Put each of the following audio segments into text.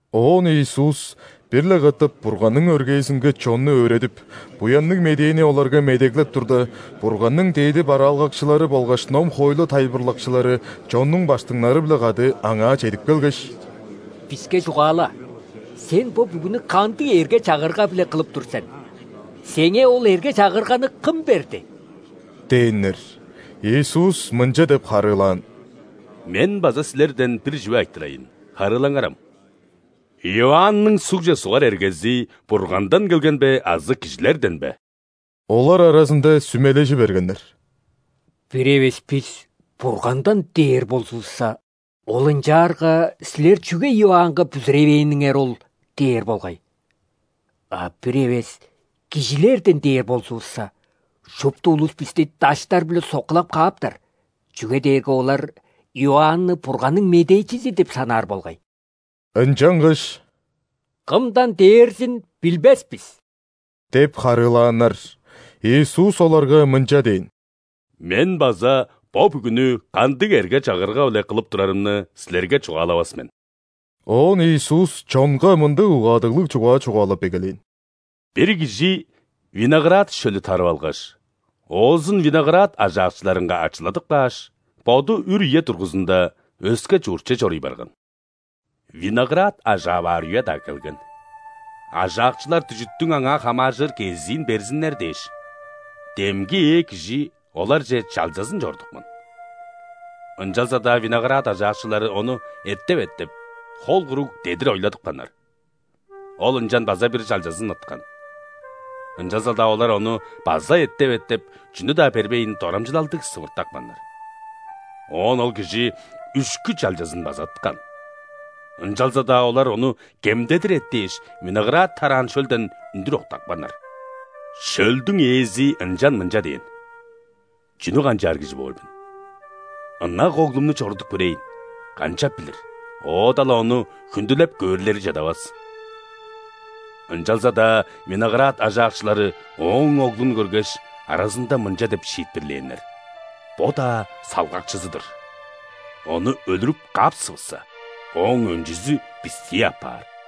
Оон Иисус бир-ле катап Бурганның өргээзинге чонну өөредип, Буянныг Медээни оларга медеглеп турда, Бурганның дээди бараалгакчылары болгаш ном-хоойлу тайылбырлакчылары чоннуң ·баштыңнары-биле кады Аңаа чедип келгеш: «Биске чугаала! Сен бо бүгүнү кандыг эрге-чагырга-биле кылып тур сен? Сеңээ ол эрге-чагырганы кым берди?» – дээннер. Иисус мынча деп харыылаан: «Мен база силерден бир чүве айтырайн, харыылаңарам: Иоанның ·сугже сугар эргези Бургандан келген бе азы кижилерден бе?» Олар аразында сүмележи бергеннер: «Бир эвес бис: „Бургандан“ – дээр болзувусса, Ол: „Ынчаарга силер чүге Иоаннга бүзүревээниңер ол?“ – дээр болгай. А бир эвес: „Кижилерден“ – дээр болзувусса, шупту улус бисти даштар-биле соккулап кааптар, чүге дээрге олар Иоанны Бурганның медээчизи деп санаар болгай». Ынчангаш: «Кымдан дээрзин билбес бис» – деп харыылааннар. Иисус оларга мынча дээн: «Мен база бо бүгүнү кандыг эрге-чагырга-биле кылып турарымны силерге чугаалавас мен». Оон Иисус чонга мындыг угаадыглыг чугаа чугаалап эгелээн: «Бир кижи виноград шөлү тарып алгаш, оозун виноград ажаакчыларынга ачыладып кааш, боду үр үе дургузунда өске чуртче чоруй барган. Виноград ажаап аар үе-даа келген. Ажаакчылар дүжүттүң аңаа хамааржыр кезиин берзиннер дээш, демги ээ кижи оларже чалчазын чорудупкан. Ынчалза-даа виноград ажаакчылары ону эттеп-эттеп, хол куруг дедир ойладыпканнар. Ол ынчан база бир чалчазын ыткан. Ынчалза-даа олар ону база эттеп-эттеп, чүнү-даа бербейн, дорамчылалдыг сывыртапканнар. Оон ол кижи үшкү чалчазын база ыткан. Ынчалза-даа олар ону кемдедир эттээш, виноград тараан шөлден үндүр октапканнар. Шөлдүң ээзи ынчан мынча дээн: „Чүнү канчаар кижи боор мен? Ынак оглумну чорудуп көрейн, канчап билир, оода-ла ону хүндүлеп көөрлери чадавас“. Ынчалза-даа виноград ажаакчылары ооң оглун көргеш, аразында мынча деп шиитпирлээннер: „Бо-даа салгакчызы-дыр! Ону өлүрүп каапсывысса, ооң өнчүзү бистии апаар“.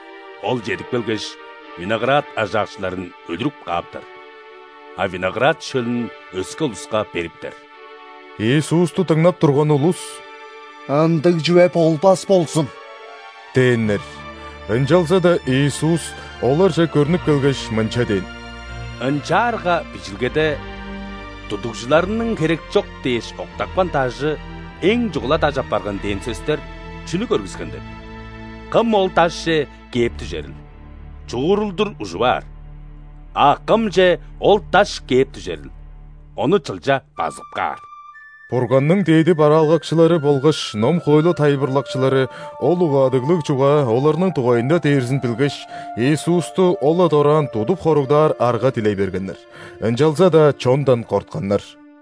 Ол чедип келгеш, виноград ажаакчыларын өлүрүп кааптар, а виноград шөлүн өске улуска бериптер». Иисусту дыңнап турган улус: «Ындыг чүве болбас болзун!» – дээннер. Ынчалза-даа Иисус оларже көрнүп келгеш, мынча дээн: «Ынчаарга Бижилгеде: „Тудугжуларның херекчок дээш, октапкан дажы эң чугула даш апарган“ – дээн сөстер чүнү көргүскен деп? Кым ол дашче кээп дүжерил, чуурулдур ужуп аар, а кымче ол даш кээп дүжерил, ону чылча базып каар». Бурганның дээди бараалгакчылары болгаш ном-хоойлу тайылбырлакчылары ол угаадыглыг чугаа оларның дугайында дээрзин билгеш, Иисусту ол-ла дораан тудуп хоругдаар арга дилей бергеннер, ынчалза-даа чондан кортканнар.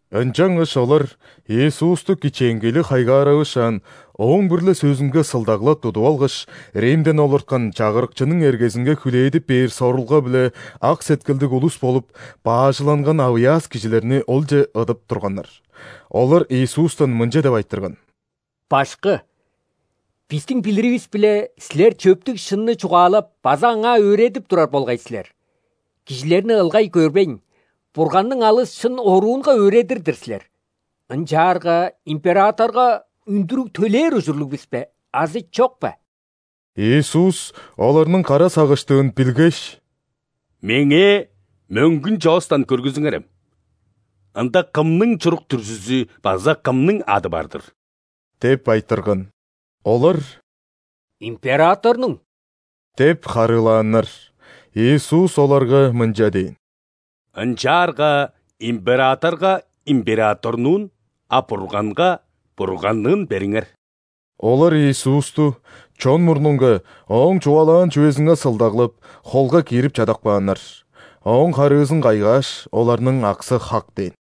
Ынчангаш олар Иисусту кичээнгейлиг хайгааравышаан, Ооң бир-ле сөзүнге сылдаглап тудуп алгаш, Римден олурткан чагырыкчының эргезинге хүлээдип бээр сорулга-биле ак сеткилдиг улус болуп баажыланган авыяас кижилерни Олче ыдып турганнар. Олар Иисустан мынча деп айтырган: «Башкы, бистиң билиривис-биле, Силер чөптүг шынны чугаалап база аңаа өөредип турар болгай силер. Кижилерни ылгай көрбейн, Бурганның алыс шын оруунга өөредир-дир силер. Ынчаарга императорга үндүрүг төлээр ужурлуг бис бе азы чок бе?» Иисус оларның кара сагыштыын билгеш: «Меңээ мөңгүн чоостан көргүзүңерем: ында кымның чурук-дүрзүзү база кымның ады бар-дыр?» – деп айтырган. Олар: «Императорнуң» – деп харыылааннар. Иисус оларга мынча дээн: «Ынчаарга императорга – императорнуун, а Бурганга – Бурганныын бериңер». Олар Иисусту чон мурнунга Ооң чугаалаан чүвезинге сылдаглап, холга киирип чадап кааннар. Ооң харыызын кайгааш, оларның аксы хак дээн.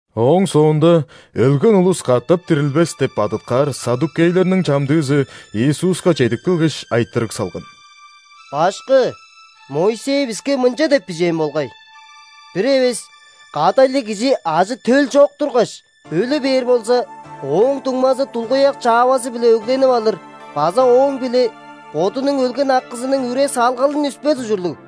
Ооң соонда «Өлген улус катап дирилбес» деп бадыткаар ·саддукейлерниң чамдыызы Иисуска чедип келгеш, айтырыг салган: «Башкы! Моисей биске мынча деп бижээн болгай: „Бир эвес кадайлыг кижи ажы-төл чок тургаш, өлү бээр болза, ооң дуңмазы дулгуяк чаавазы-биле өгленип алыр база ооң-биле бодунуң өлген акызының үре-салгалын үспес ужурлуг“.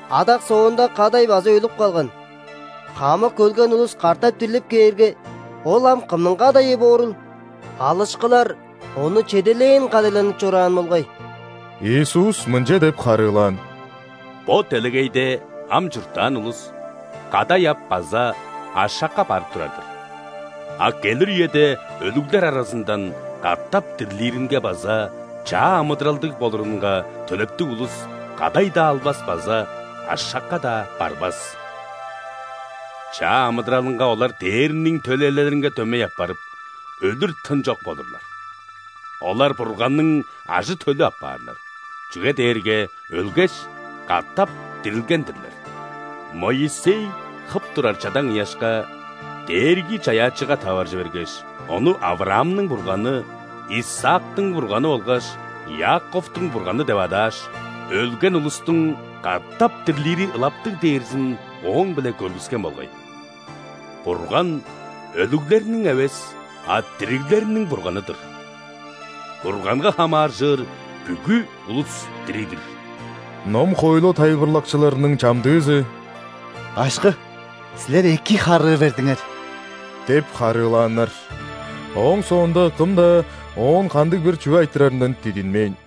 Адак соонда кадай база өлүп калган. Хамык өлген улус катап дирлип кээрге, ол ам кымның кадайы боорул? Алышкылар ону чедээлээн кадайланып чораан болгай». Иисус мынча деп харыылаан: «Бо делегейде ам чурттаан улус кадай ап база ашакка барып турар-дыр. А келир үеде өлүглер аразындан катап дирлиринге база чаа амыдыралдыг болурунга төлептиг улус кадай-даа албас база ашакка-даа барбас. Чаа амыдыралынга олар ·дээрниң төлээлеринге дөмей апарып, өлүр тын чок болурлар. Олар Бурганның ажы-төлү апаарлар, чүге дээрге өлгеш, катап дирилген-дирлер. Моисей хып турар чадаң ыяшка Дээрги-Чаяакчыга таваржы бергеш, Ону Авраамның Бурганы, Исаактың Бурганы болгаш Иаковтуң Бурганы деп адааш, өлген улустуң катап дирлири ылаптыг дээрзин ооң-биле көргүскен болгай. Бурган – өлүглерниң эвес, а дириглерниң Бурганы-дыр! Бурганга хамааржыр бүгү улус дириг-дир!» Ном-хоойлу тайылбырлакчыларының чамдыызы: «Башкы, Силер эки харыы бердиңер!» – деп харыылааннар. Ооң соонда кым-даа Оон кандыг-бир чүве айтырарындан дидинмээн.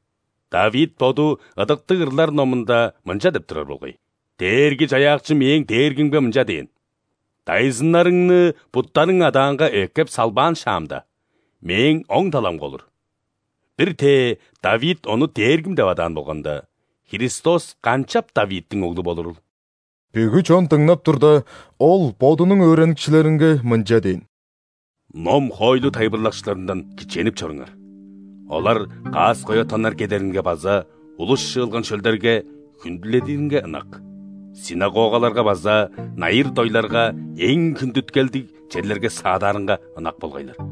Давид боду Ыдыктыг ырлар номунда мынча деп турар болгай:„Дээрги-Чаяакчы мээң Дээргимге мынча дээн:‘Дайзыннарыңны буттарың адаанга эккеп салбаан шаамда,Мээң оң таламга олур’“. Бир-тээ Давид Ону Дээргим деп адаан болганда, Христос канчап Давидтиң оглу болурул?» Бүгү чон дыңнап турда, Ол Бодунуң өөреникчилеринге мынча дээн: «Ном-хоойлу тайылбырлакчыларындан кичээнип чоруңар. Олар каас-коя тоннар кедеринге база улус чыылган шөлдерге хүндүледиринге ынак, ·синагогаларга база найыр-дойларга эң хүндүткелдиг черлерге саадаарынга ынак болгайлар.